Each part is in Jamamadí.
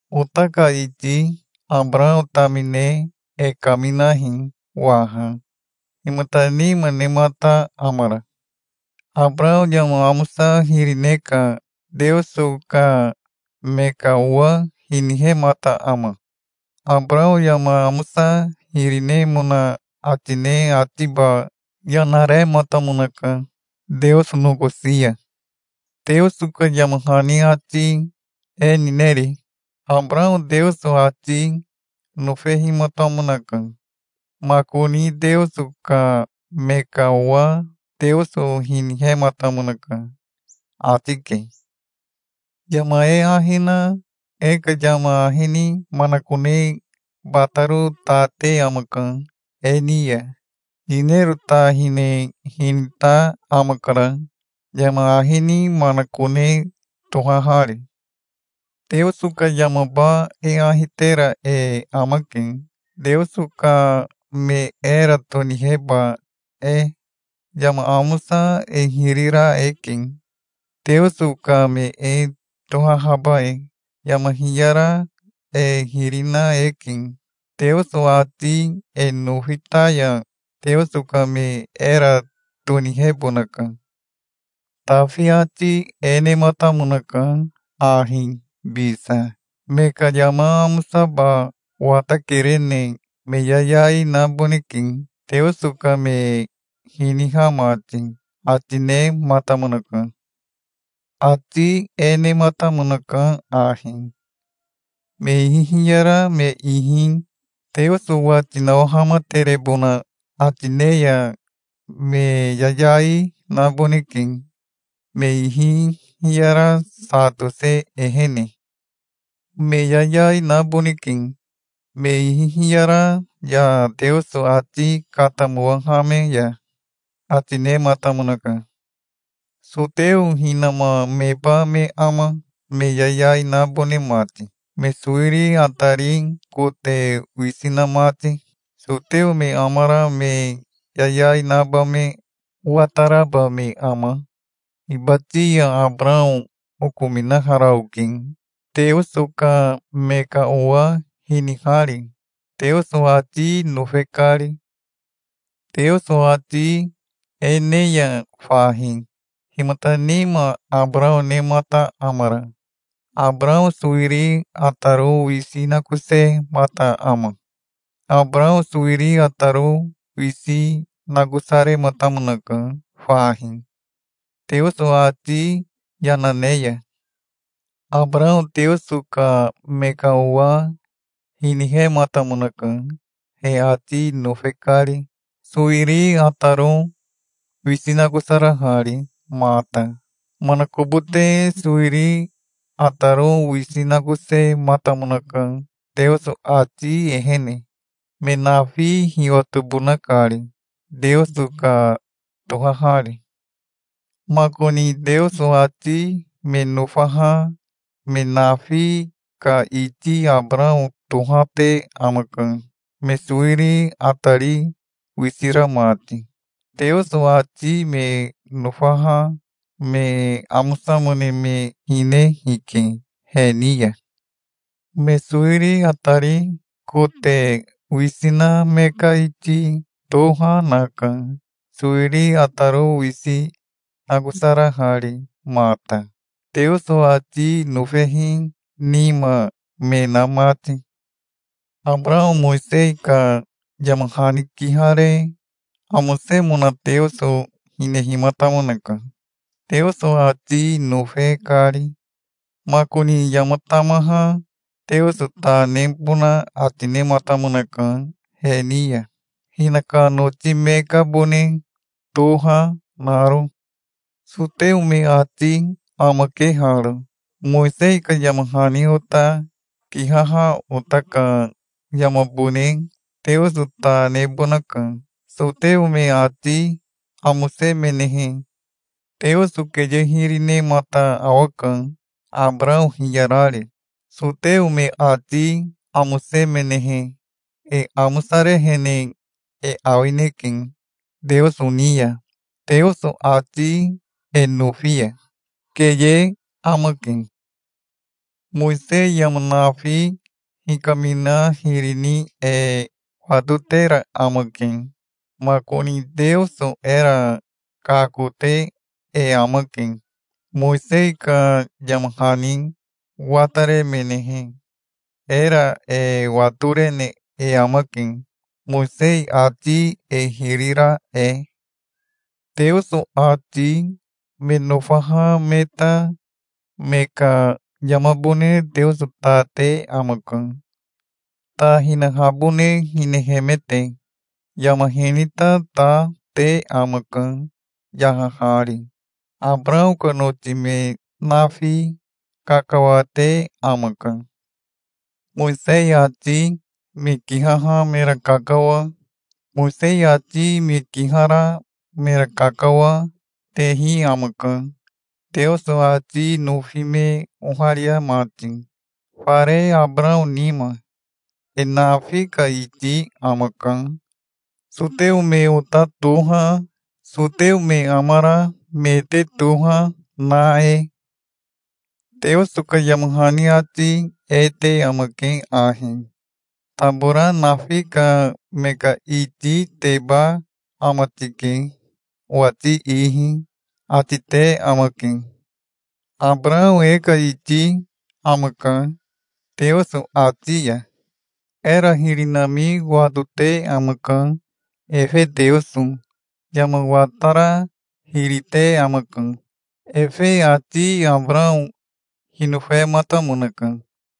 Ota ka iti Abarao tamine e kaminahi waha. Himata nima nemata amara? Abarao yama amosa hiri ne ka Teoso ka me ka owa hinihemata ama? Abarao yama amosa hiri nemona ati ne atiba yana rematamonaka Teoso nokosi ya. Teoso ka yama hani ati e nineri? "Abarao Teoso ati nofehimatamonaka. Makoni Teoso ka me ka owa Teoso hinihematamonaka", ati ke. Yama e ahi na e ka yama ahi ni manakone bataro ta te amaka e ni ya. Yinero ta hine hinita amakara, yama ahi ni manakone tohahari. Teoso ka yamaba e ahi tera e amake, Teoso ka me era toniheba e. Yama amosa e hiri ra eke, Teoso ka me e tohahaba e. Yama hiyara e hiri na eke. Teoso ati e nofi ta ya, Teoso ka me era tonihebonaka. Tafi ati e nematamonaka ahi bisa: "Me ka yama amosaba watakerene me yayai naboneke, Teoso ka me hiniha mati", ati nematamonaka. Ati e nematamonaka ahi: "Me ihi hiyara me ihi Teoso wati nawahamaterebona ati ne ya me yayai naboneke, me ihi hiyara sa tose ehene. Me yayai naboneke, me ihi hiyara ya Teoso ati katamowahame ya", ati nematamonaka. Soteo hinama meba me ama, me yayai nabone mati, me sowiri atari kote wisi na mati? Soteo me amara me yayai naba me wataraba me ama? Hibati ya Abarao okominahara oke, Teoso ka me ka owa hinihari, Teoso ati nofe kari. Teoso ati e ne ya fahi, himata nima Abarao nemata amara? Abarao sowiri ataro wisi nakosemata ama? Abarao sowiri ataro wisi nakosarematamonaka fahi, Teoso ati yana ne ya. Abarao Teoso ka me ka owa hinihematamonaka, he ati nofe kari, sowiri ataro wisi nakosarahari mata. Manakobote sowiri ataro wisi nakosematamonaka Teoso ati ehene, me nafi hiwatobona kari, Teoso ka tohahari. Makoni Teoso ati me nofaha me nafi ka iti Abarao tohate amaka, me sowiri atari wisi ra mati. Teoso ati me nofaha me amosamone me hine hike, he ni ya. Me sowiri atari kote wisi na me ka iti toha naka, sowiri ataro wisi nakosarahari mata, Teoso ati nofehi nima me na mati. Abarao Mowisei ka yama hani kihare amosemona Teoso hinehimatamonaka, Teoso ati nofe kari. Makoni yama tamaha Teoso ta nebona ati nematamonaka he ni ya, hinaka noti me kabone toha naro. Soteo me ati amake haro: "Mowisei ka yama hani ota kihaha ota ka yamabone Teoso ta nebonaka". Soteo me ati amosemenehe Teoso keye hiri nenamata awaka, Abarao hiyarari. Soteo me ati amosemenehe e amosarehene e awineke Teoso ni ya, Teoso ati e nofi ya. Keye amake. Mowisei yama nafi hikamina hiri ni e watotera amake. Makoni Teoso era kakote e amake. Mowisei ka yama hani wataremenehe era e watorene e amake, Mowisei ati e hiri ra e. Teoso ati me nofaha me ta me ka yamabone Teoso ta te amaka, ta hinahabone hinehemete. Yama hinita ta te amaka, yahahari. Abarao ka noti me nafi kakawate amaka. Mowisei ati me kihaha mera kakawa, Mowisei ati me kihara mera kakawa, tehi amaka, Teoso ati nofi me oharia mati, fare Abarao nima. E nafi ka iti amaka, soteo me ota toha, soteo me amara me te toha, na e. Teoso ka yama hani ati e te amake ahi: "Tabora nafi ka me ka ititeba ama tike owati ihi", ati te amake. Abarao e ka iti amaka, Teoso ati ya. Era hiri nami watote amaka, efe, Teoso. Yama watara hiri te amaka. Efe ati Abarao hinofematamonaka.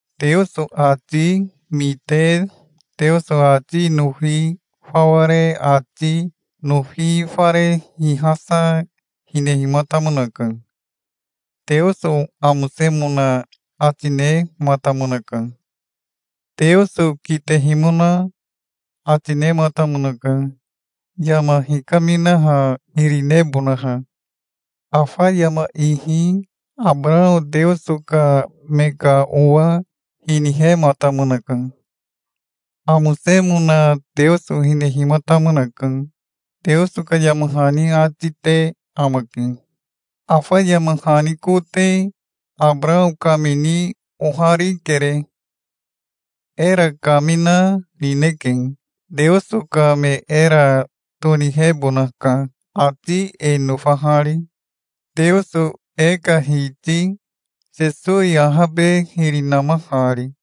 Teoso ati mite Teoso ati nofi fawa re ati nofi fare hihasa hinehimatamonaka. Teoso amosemona ati nematamonaka. Teoso kitehimona ati nematamonaka, yama hikaminaha hiri nebonaha. Afa yama ihi Abarao Teoso ka me ka owa hinihematamonaka. Amosemona Teoso hinehimatamonaka, Teoso ka yama hani ati te amake. Afa yama hani kote Abarao kamini oharikere. Era kamina nineke. Teoso ka me era tonihebonaka, ati e nofahari, Teoso e ka Hiti Sesowi ahabe hiri namahari.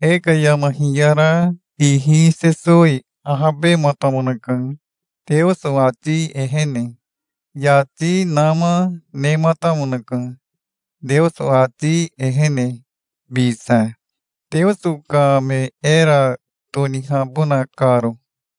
E ka yama hiyara ihi Sesowi ahabematamonaka Teoso ati ehene. Yati nama nematamonaka, Teoso ati ehene bisa, Teoso ka me era tonihabona karo.